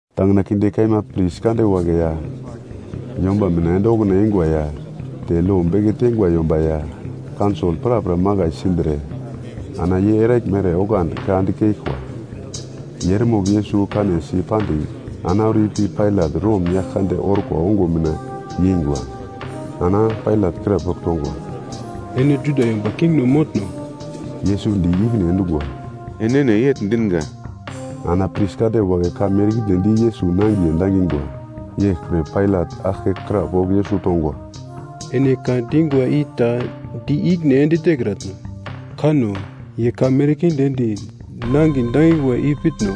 Tangina kinde kaima pris kande wagle ya, yomba mina ende okuna eingwa ya te lo beke teingwa yomba ya, kaunsol prapra makai sindre ana ye eraglmere oglandi ka dikeglkwa. Ye eremogl Yesus kanesi pandigl ana auro ipi Pailat Rom yagl kande orkwa ongo mina yeingwa. Ana Pailat krapogl tongwa, “Ene Juda yomba kingno motno?” Yesus di ikine endungwa, “Enene yegl dinga.” Ana pris kande wagle ka merkinde di Yesus nangiye dangingwa. Yeglpre Pailat aglke krapogl Yesus tongwa, “Ene ka dingwa i ta di ikine ende tekratno? Kanno, ye ka merkinde di nangin dangingwa i pitno?”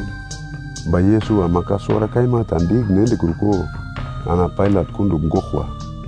Ba Yesus ama ka suwara kaima ta di ikine endekruko, ana Pailat kundugl goglkwa.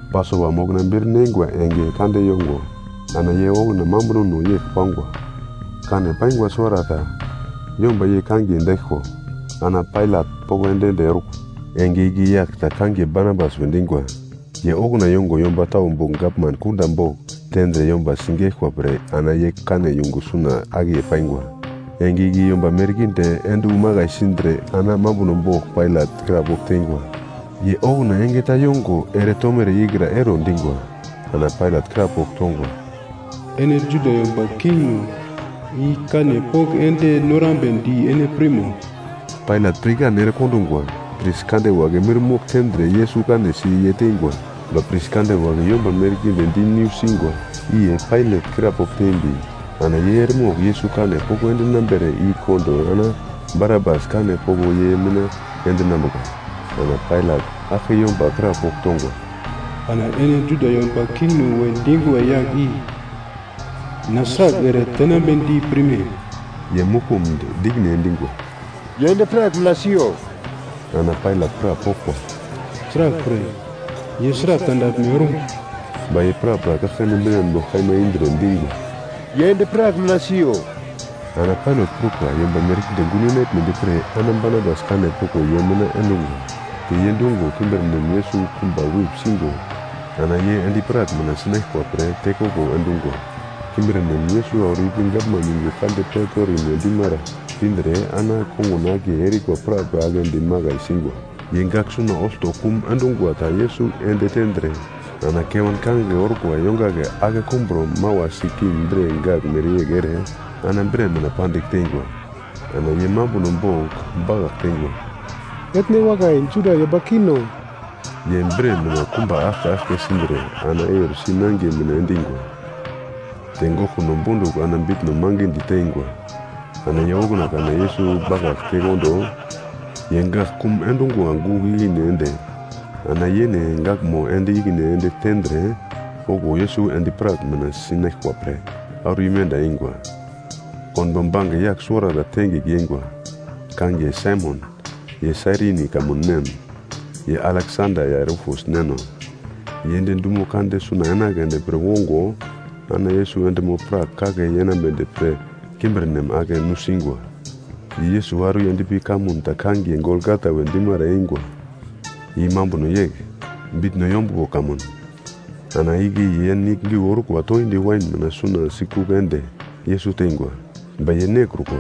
Pasova mokna bir neingwa enge kande yongo ana ye okuna mambunono yegl pangwa. Kane paingwa suwarata yomba ye kangiye daiglko, ana Pailat poko ende-ende orkwa. Enge igle yagl ta kangiye Barabas we dingwa, ye okuna yongo yomba tau bogl gavman kunda bogl tendre yomba sigeglkwa pre ana ye kane yungu suna akiye paingwa. Enge igle yomba merkinde ende wu makai sindre ana mambuno bogl Pailat krapogl teingwa. Ye okuna enge ta yongo ere tomere ikra ero dingwa. Ana Pailat krapogl tongwa, “Ene Juda yomba kingno i kane poko ende norambedi ene pirmo?” Pailat pirkan ere kondingwa. Pris kande wagle mirmogl tendre Yesus kanesi ye teingwa. Ba pris kande wagle yomba merkinde di nusingwa, i ye Pailat krapogl tembi ana ye eremogl Yesus kane poko endinambere i kondo ana Barabas kane poko ye mina endinambuka. Ana Pailat aglke yomba krapogl tongwa, “Ana ene Juda yomba kingno we dingwa yagle i na sragl ere tenambedi pirme?” Ye muglkumdi di ikine endingwa, “Ye endi-prak mina siyo.” Ana Pailat krapoglkwa, “Sraglpre? Ye sragl tandaglme orum?” Ba ye prapra kaglkane binan bogl kaima indre dingwa, “Ye endi-prak mina siyo!” Ana Pailat prukwa yomba merkinde gun yenaglmedi pre, ana Barabas kane poko ye mina endungwa. Te ye dungo kimbirnem Yesus kumba wip singo ana ye endi-prak mina sinaglkwa pre tekoglo endungwa. Kimbirnem Yesus auro ipi gavman yungu kande Pretorim we dimara pindre ana ye kongun akiye erikwa prapra aglendi makai singwa. Ye gagl suna olto kum endungwa ta Yesus ende tendre ana kewan kangigle orkwa yongagle ake kumbro mawasi king bre gagl mereyegl ere, ana bre mina pandigl teingwa. Ana ye mambuno bogl bakagl teingwa, “Etne wakai, Juda yomba kingno!” Ye bre mina kumba aglke aglke sindre ana eur si nangiye mina endingwa. Te goglkuno bondugl ana bitno mangidi teingwa. Ana ye okuna kana Yesus bakagl tekondo, ye gagl kum endungwa gugl ikine ende ana yene gaglmo ende ikine ende tendre, okuwo Yesus endi-prak mina sinaglkwa pre auro imenda eingwa. Konbo bange yagl suwarata tengigl yeingwa, kangiye Saimon, ye Sairini kamun nem. Ye Aleksanda ya Rufus neno, ye ende dumo kande suna enagledi pre wongo ana Yesus endimo-prak kake yenambedi pre kimbirnem ake nusingwa. Ye Yesus auro yendpi kamun ta kangiye Golgata we dimara eingwa. (I mambuno yegl, bitno yombuglo kamun.) Ana igle ye nigl giu orkwa toindi wain mina suna sikugl ende Yesus teingwa. Ba ye nekrukwa.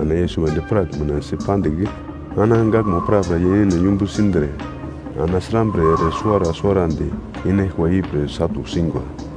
Ana Yesus endi-prak mina si pandigl ana gaglmo prapra ye yene yumbu sindre, ana srambre ere suwara suwarandi inaglkwa ipre satu singwa.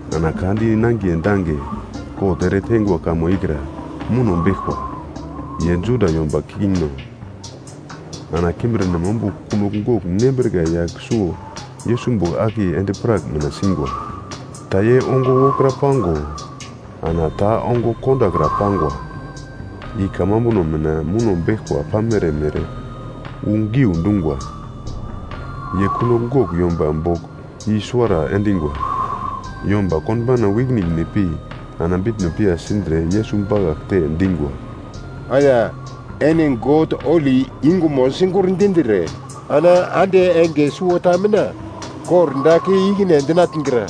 Ana ka di nangiye dange kot ere teingwa kamo ikra muno beglkwa, “Ye Juda Yomba Kingno.” Ana kimbirnem ombugl kunogl gogl nembrika yagl suwo Yesus bogl akiye endi-prak mina singwa. Ta ye ongo wokra pango ana ta ongo kondakra pangwa. I Kamambuno mina muno beglkwa pamere mere wu geundungwa. Ye kunogl gogl yomba bogl i-suwara endingwa. Yomba konbauna wu ikine ikine pi ana bitno piya sindre Yesus bakaglte dingwa, “Aya, ene God holi yungumo sigurndindre, ana ande enge suwota mina kordagl kei ikine endinatngra.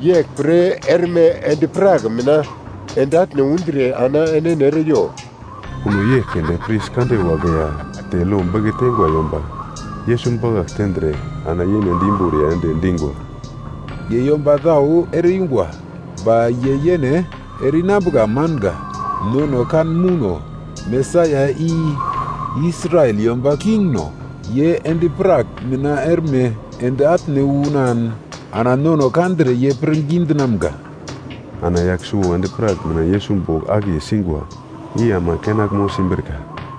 Yeglpre erme endi-prak mina ende atne undre ana enene ere yo!” Kuno yegl keunde pris kande wagle ya te lo beke teingwa yomba, Yesus bakagl tendre ana yene di imboriya ende dingwa, “Ye yomba tau ere-yungwa, ba ye yene ere-inambuka manga! Nono kan mouno, Mesaia, i Israel yomba Kingno, ye endi-prak mina erme ende atne unan ana nono kandre ye pirngi dinamga.” Ana yagl suwo endi-prak mina Yesus bogl akiye singwa, i ama kenaglmo simbrika.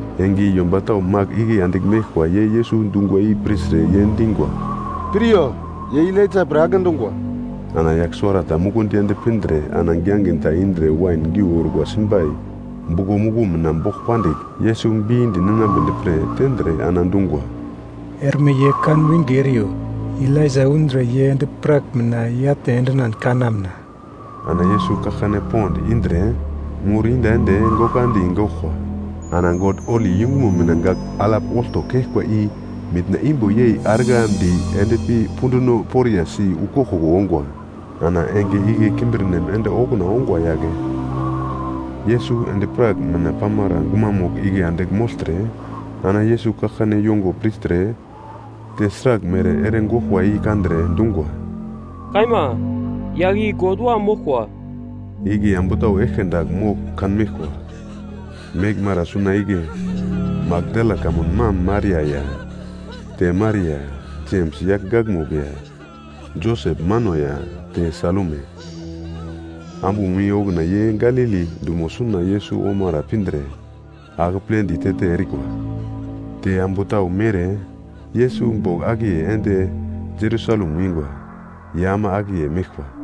Enge i yomba tau magl igle andigl meglkwa, ye Yesus dungwa i pirtre ye dingwa, “Piryo, ye Elaija pre agle dungwa.” Ana yagl suwarata mukundi ende pindre ana giangin ta indre wain geu orkwa simbai buglo muglo mina bogl pandigl, Yesus bindi ninambedi pre tendre ana dungwa, “Erme ye kan winge eriyo, Elaija undre ye endi-prak mina i-atne endinan kanamna.” Ana Yesus kaglkane pond indre mur iyenda ende gokandi goglkwa. Ana God holi yungumo mina gagl alap olto keglkwa i mitna imbo yei arglandi endpi punduno poriya si wu koglkoglo ongwa. Ana enge igle kimbirnem ende okuna ongwa yagle, Yesus endi-prak mina pamara gumamugl igle andigl mogltre ana Yesus kaglkane yungo pirtre, te sraglmere ere goglkwa i kandre, dungwa, “Kaima, yagl i God Wam moglkwa.” Igle ambu tau eglke dagl mogl kanmeglkwa. Meglmara suna igle Makdala kamun mam Maria ya, te Maria, Jems yagl gakmugl ya Joses mano ya, te Salume. Ambumo i okuna ye Galili dumo suna Yesus omara pindre akepledi te-te erikwa. Te ambu tau mere Yesus bogl akiye ende Jerusalem wingwa ye ama akiye meglkwa.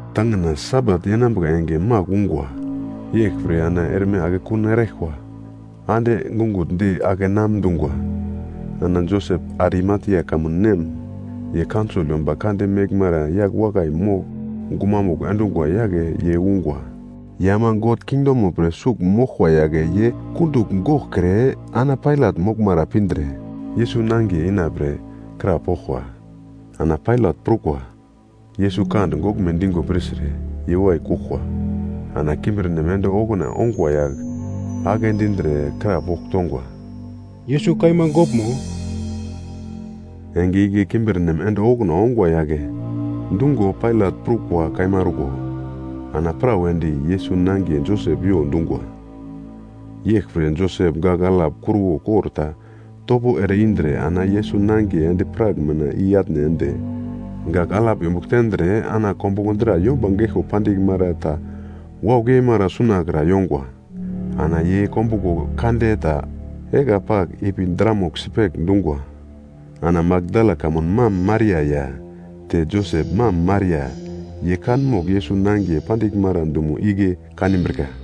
Tangina Sabat yenambuka enge magl ungwa, yeglpre ana erme akekun eraglkwa ande gungutndi ake namdungwa. Ana Josep Arimatia kamun nem, ye kaunsol yomba kande meglmara yagl wakai mogl gumamugl endungwa yagle ye ungwa. Ye ama God kingdomo pre sugl moglkwa yagle ye kundugl goglkre ana Pailat moglmara pindre, Yesus nangiye ina pre krapoglkwa. Ana Pailat prukwa Yesus kande goglme dingo pirtre, ye wai kuglkwa. Ana kimbirnem ende okuna ongwa yagl agle dindre krapogl tongwa, “Yesus kaima goglmo?” Enge igle kimbirnem ende okuna ongwa yagle dungo Pailat prukwa kaima orko ana pra wedi, Yesus nangiye Josep yo dungwa. Yeglpre Josep gagl alap kruwo kor ta topo ere indre ana Yesus nangiye endi-prak mina i atne ende, gagl alap yombugl tendre ana kombuglo dra yomba geglko pandiglmara ta waugl yeimara sunakra yongwa. Ana ye kombuglo kande ta egla pagl ipi dramugl sipegl dungwa. Ana Makdala kamun mam Maria ya te Joses mam Maria, ye kanmogl Yesus nangiye pandiglmara dumo igle kanbrika.